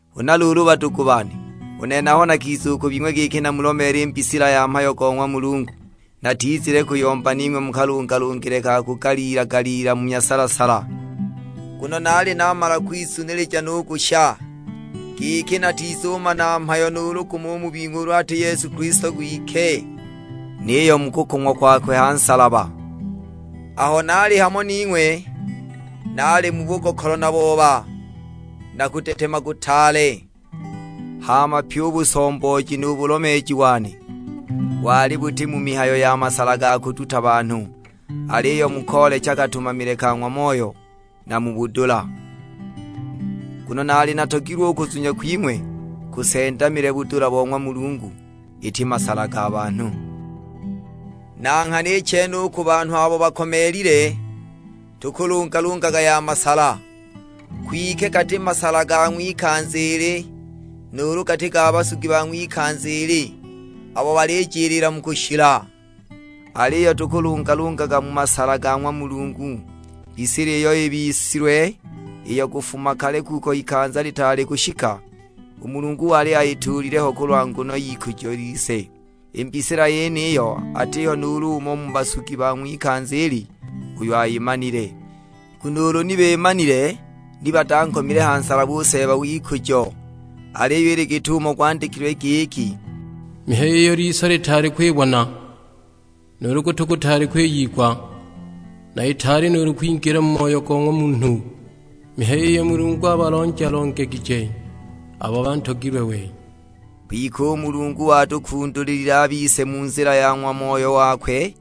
Huna luulu badugu bane, u nene aho nakiza u ku bing'we giki namulomeele i mbisila ya mhayo go ng'wa Mulungu, natizile kuyomba ning'we mu kalungalungile ka kugaliila-galiila, mu nyasala-sala. Nguno naali namala kwizunilija nugusha, giki natizumana mhayo nuulu gumo u mu bing'we ulu ati Yesu Kilisto kwike, niyo mu kukong'wa kwakwe ha nsalaba. Aho naali hamo ning'we, naali mu bugokolo na booba, na kudetema kutaale. Hama pyi u busombooji nu bulomeeji wane, wali buti mu mihayo ya masala ga kuduta banhu; aliyo mu koolecha katumamile ka ng'wa Moyo, na mu budula. Nguno naali natogilwe u kuzunya kwing'we kusendamile budula bo ng'wa Mulungu, iti masala ga banhu. Na nghana i chene u ku banhu abo bakomeelile, tukulungalungaga ya masala; kwike gati masala ga ng'wikanza ili, nuulu gati ga basugi ba ng'wikanza ili, abo balijiliila mu kushila. Aliyo tukulungalungaga mu masala ga ng'wa Mulungu mbisila iyo ibisilwe; iyo kufuma kale kuko ikanza litaali kushika, u Mulungu wali ayituulile ho kulwa nguno y'ikujo lise. I mbisila yeniyo, atiho nuulu umo u mu basugi ba ng'wikanza ili uyo ayimanile, nguno ulu ni bimanile ni batankomile ha nsalaba u Seeba w'ikujo. Aliyo ili git'umo gwandikilwe; giki, "Mihayo iyo liso litaali kwibona, nuulu gutu gutaali kwiyigwa; na itaali nuulu kwingila mu moyo go ng'wa munhu; mihayo iyo Mulungu abalonja-longegije abo bantogilwe we." Kwike u Mulungu watukundulilile a bise mu nzila ya ng'wa Moyo wakwe;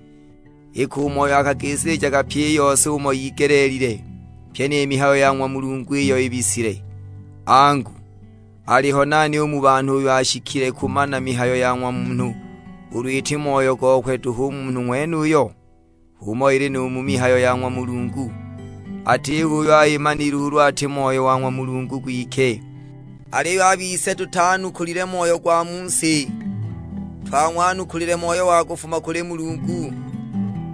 iki u Moyo akagisilijaga pyi i yose umo igelelile, pyi ni mihayo ya ng'wa Mulungu iyo yibisile. Angu, aliho nani u mu banhu uyo ashikile kumana mihayo ya ng'wa munhu ulu iti moyo gokwe duhu u munhu ng'wenuyo? H'umo ili nu mu mihayo ya ng'wa Mulungu, atiho uyo ayimanile ulu ati Moyo wa ng'wa Mulungu gwike. Aliyo a bise tutanukulile moyo gwa mu si, twang'wanukula Moyo wa kufuma kuli Mulungu;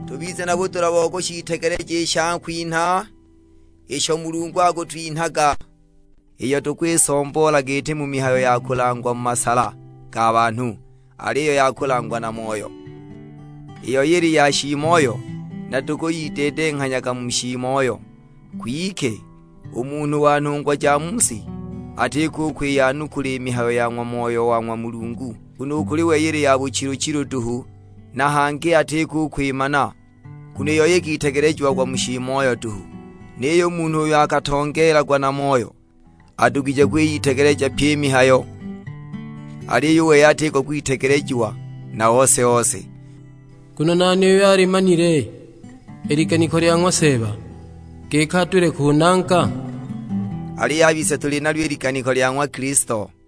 tubize na budula bo kushiitegeleja i shakwinha isho Mulungu akutwinhaga. Iyo tukwisomboolaga iti mu mihayo ya kulangwa mu masala ga banhu, aliyo ya kulangwa na Moyo; i yoi ili ya shiimoyo, na tukuyideedenghanyaga mu shiimoyo. Kwike u munhu wa nhungwa ja mu si, atiko u kwiyanukula i mihayo ya ng'wa Moyo wa ng'wa Mulungu. Nguno u kuli wei ili ya buchilu-chilu duhu, na hangi atiko u kwimana; nguno i yoi ikitegelejiagwa mu shiimoyo duhu. Niyo u munhu uyo akatongeelagwa na Moyo, adugije kwiyitegeleja pyi i mihayo, aliyo u wei atiko kwitegelejiwa na ose-ose. Nguno nani uyo alimanile i liganiko lya ng'wa Seeba, giki adule kunanga? Aliyo a bise tuli nalyo i liganiko lya ng'wa Kilisto.